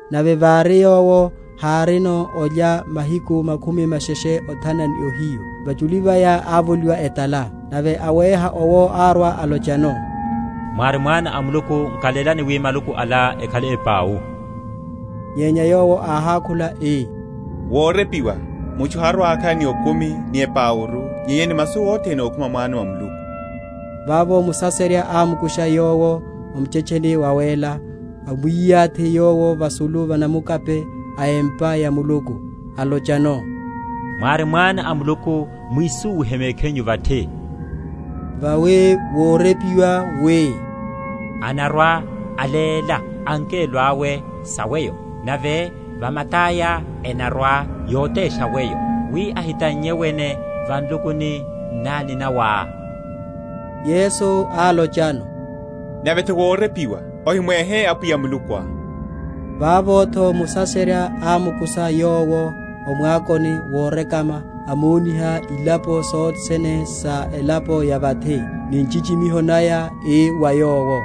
Nave vári Yowo hárino olya mahiku makhumi masheshe othana ni ohiyu, vachuli vaya ávoliwa etala. Nave awéha owo árwa alochano, Mwári Mwana a Muluku, nkalélani wi maluku ala ekhale ipau. Nyenya Yowo áhákhula ii, Wórepiwa, Mutchu harwa‐akhala ni okumi ni epauru, nyenya ni masu othene ókhuma mwano mwa Muluku. Vavo Musaserya ámukusha Yowo o muchetcheni wawéla; amwiyathi Yowo vasulu va namukaphe a empa ya Muluku, alochano, Mwári Mwana a Muluku, mwisúwihe mekhinyu vathi: vawi wórepiwa, wi, Anarwa‐aléla angelo awe sa weyo, Nave va mataya enarwa‐yotesha weyo, Wi ohitannye wene va nlukuni nnani nawá. Yesu álochano, Nave’tho wórepiwa, Ohimwéhe Apwiya Mulukuá. Vavo’tho Musaserya ámukusha Yowo o mwakoni worekama, amoniha ilapo sothe sene sa elapo ya vathi, ni nchichimiho naya; ii wa Yowo,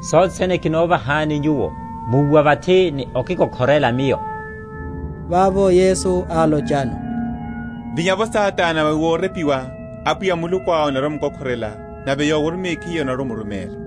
Sothe sene kinovahani Nyuwo, múwa vathi ni okikokhorela miyo. Vavo Yesu álochano, Vinya’vo Satana, vawi wórepiwa, Apwiya Mulukuá onarwa‐omukokhorela, Nave Yowo mekhiyeru onarwa‐omuruméla.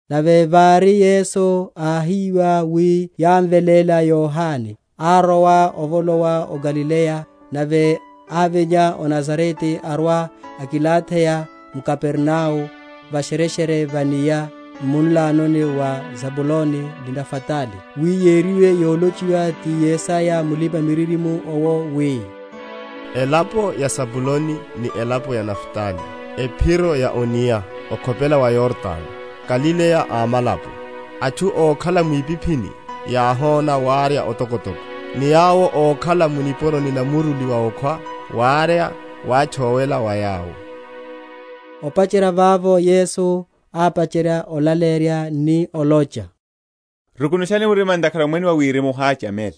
Nave vári Yesu áhiwa wi yámveléla Yohane, árowa ovolowa o Galileya; nave ávinya o Nazarete arwa akilatheya m’Kapernao a va’shereshere va enia, m’munlano wa Zabuloni ni Naftali: wi yériwe yolochiwa ti Yesaya mulipa‐miririmo’wo, wi, Elapo ya Zabuloni ni elapo ya Naftali, Ephiro ya o’nia, okhopela wa Yordano, Galileya a amalapo. Atchu ókhala mwipiphini Yáhona wárya otokotoko, Ni yawo ókhala mu nipuroni na muruli wa okhwa, Wárya wátchowela wa yawo. Opacherya vavo Yesu ápacherya olaleyerya, ni olocha, Rukunushani mirima, ntakhara Omwene wa Wirimu woháchamela.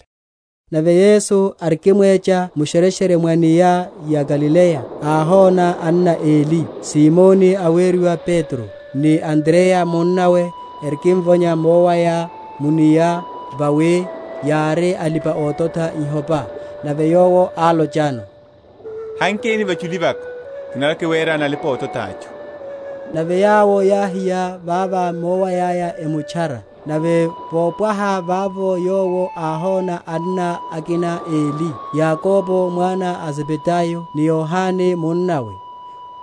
Nave Yesu arikimwecha mu’shereshere mwa enia ya Galileya, áhona anna eli, Simoni aweriwa Petro, ni Andreya munnawe, erikimvonya mowaya mu’nia; vawi yári alipa‐ototha ihopa. Nave Yowo álochano, Hankeni va’chuli vaka, kinarwa‐kiwerani alipa‐ototha atchu. Nave yawo yáhiya vava miowayaya, emutchara. Nave vópwaha vavo Yowo áhona anna akina eli, Yakobo mwana a Zebedayo, ni Yohane munnawe,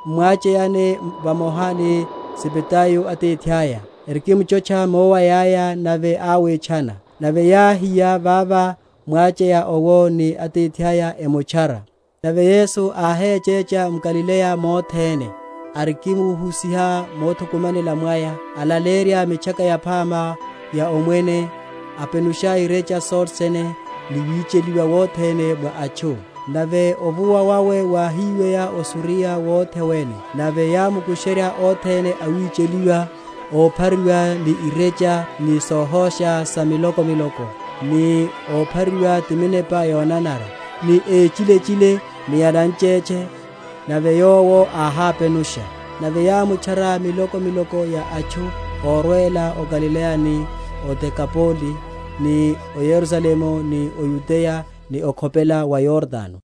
m’mwacheyani vamoha ni Zebedayo atithaya, erikimchotcha miowayaya; nave áwitchana. Nave yáhiya vava mwacheya owo ni atithaya, emutchara. Nave Yesu áhechecha m’Galileya mothene, arikimhusiha mothukumanela mwaya, alaleyerya mitchaka yaphama ya Omwene, apenusha irecha sothene ni wicheliwa wothene mwa atchu. Nave ovuwa wawe wáhiweya o Suriya wothe wene: nave yámkusherya othene awicheliwa, óphariwa ni irecha ni sohosha sa miloko miloko, ni óphariwa ti minepa yonanara, ni échilechile, ni ananchetche; nave Yowo áhápenusha. Nave yámutchara miloko miloko ya atchu órwela o Galileya ni o Dekapole, ni o Yerusalemu, ni o Yudeya ni okhopela wa Yordano.